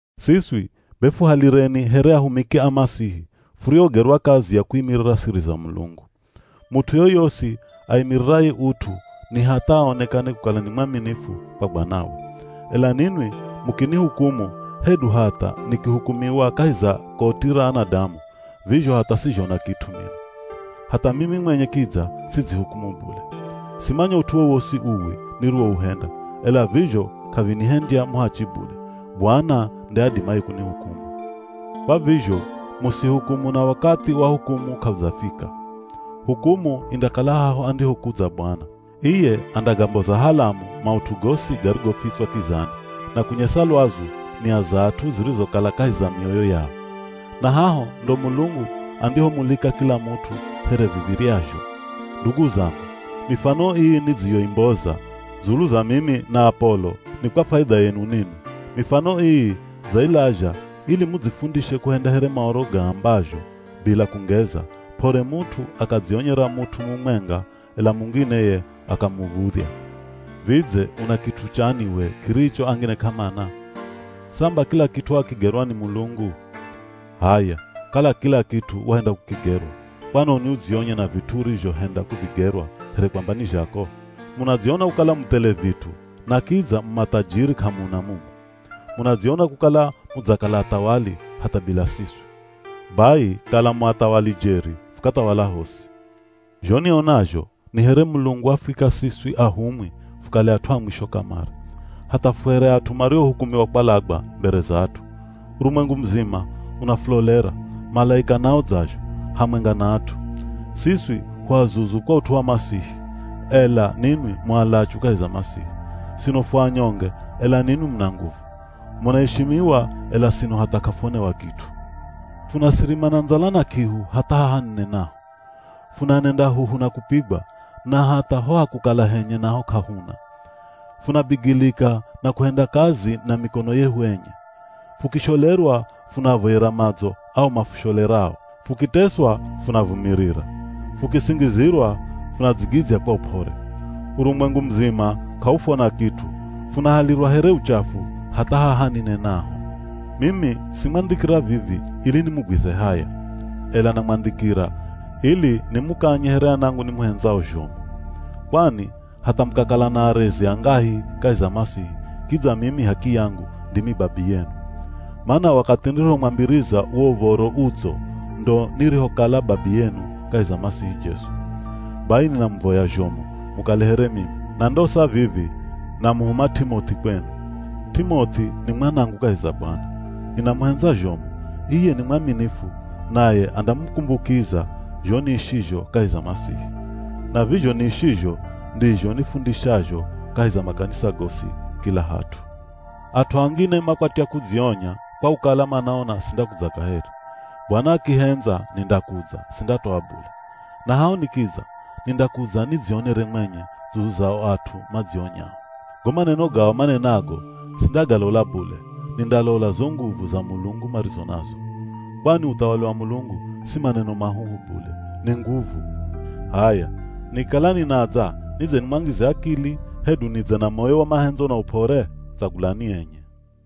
Siswi be fuhalireni here ahumiki a Masihi furiogerwa kazi ya kuimirira siri za Mulungu. Mut'u yoyosi aimiriraye ut'u ni hatha aonekane kukala ni mwaminifu kwa bwanawe. Ela ninwi mukinihukumu, hedu hatha nikihukumiwa kahi za koti ra anadamu, vizho hatha sizhona kit'u mino. Hatha mimi mwenye kidza sidzihukumu bule. Simanya ut'u wowosi uwi niriwouhenda, ela vizho k'avinihendya muhachi bule. Bwana nde adimaye kunihukumu. Kwa vizho musihukumu na wakathi wa hukumu k'audzafika. Hukumu indakala haho andihokudza Bwana. Iye andagamboza halamu maut'u gosi garigofitswa kizani, na kunyesa lwazu nia za at'u zirizokala kahi za mioyo yao. Na haho ndo Mulungu andihomulika kila mut'u here viv̱iryazho. Ndugu zangu, mifano ii nidziyoimboza dzulu za mimi na Apolo, ni kwa faidha yenu ninwi. Mifano ii dzailazha ili mudzifundishe kuhenda here Maoro gaambazho bila kungeza, p'ore mut'u akadzionyera mut'u mumwenga, ela mungine ye akamuv̱udhya. Vidze una kit'u chani we kiricho angine k'amana? Samba kila kit'u wakigerwa ni Mulungu! H'aya kala kila kit'u wahenda kukigerwa, kwanoni udzionye na vit'u urizhohenda kuvigerwa here kwamba ni zhako? Munadziona kukala mu thele vit'u na kidza mu mathajiri k'amuna mumu. Munadziona kukala mudzakala athawali hatha bila siswi. Bai kala mu athawali jeri fukathawala hosi! Zho nionazho ni here Mulungu wafwika siswi ahumwi fukale at'u a mwisho kamare. Hatha fu here at'u mariohukumiwa kwalagwa mbere za at'u. Urumwengu muzima unafulolera, malaika nao dzazho, hamwenga na at'u. Siswi hu azuzu kwa ut'u wa Masihi, ela ninwi mu alachu kahi za Masihi. Sino fu anyonge, ela ninwi muna nguvu. Munaishimiwa ela sino hatha k'afuonewa kit'u. Funasirima na ndzala na k'ihu hatha haha ninenaho. Funanenda huhu na kupigwa, na hatha ho ha kukala henye naho k'ahuna. Funabigilika na kuhenda kazi na mikono yehu enye. Fukisholerwa, funaavoyera madzo ao mafusholerao. Fukiteswa, funavumirira. Fukisingizirwa, funadzigidzya kwa up'ore. Urumwengu muzima k'aufwona kit'u, funahalirwa here uchafu hatha haha ninenaho. Mimi simwandhikira vivi ili nimugwize haya, ela namwandhikira ili nimukanye here anangu nimuhendzao zhomu. Kwani hatha mukakala na arezi angahi kahi za Masihi kidza mimi h'akiyangu ndimi babiyenu. Mana wakathi nirihomwambiriza wo Uv̱oro Udzo ndo nirihokala babiyenu kahi za Masihi Jesu. Bai ninamuvoya zhomu mukale here mimi. Na ndosa vivi namuhuma T'imoth'i kwenu. T'imoth'i ni mwanangu kahi za Bwana. Ninamuhendza zhomu. Iye ni mwaminifu naye andamukumbukiza zho niishizho kahi za Masihi. Na vizho niishizho ndizho nifundishazho kahi za makanisa gosi kila hat'u. At'u angine makwatya kudzionya kwa kukala manaona sindakudza kaheri. Bwana akihendza nindakudza, sindatoa bule. Na haho nikidza nindakudza nidzionere mwenye dzulu za o at'u madzionyao. Go maneno gao manenago sindagalola bule, nindalola zo nguvu za Mulungu marizo nazo. Kwani uthawali wa Mulungu si maneno mahuhu bule, ni nguvu. H'aya, nikikala ninadza nidze nimwangize akili, hedu nidze na moyo wa mahendzo na up'ore? Tsagulani enye.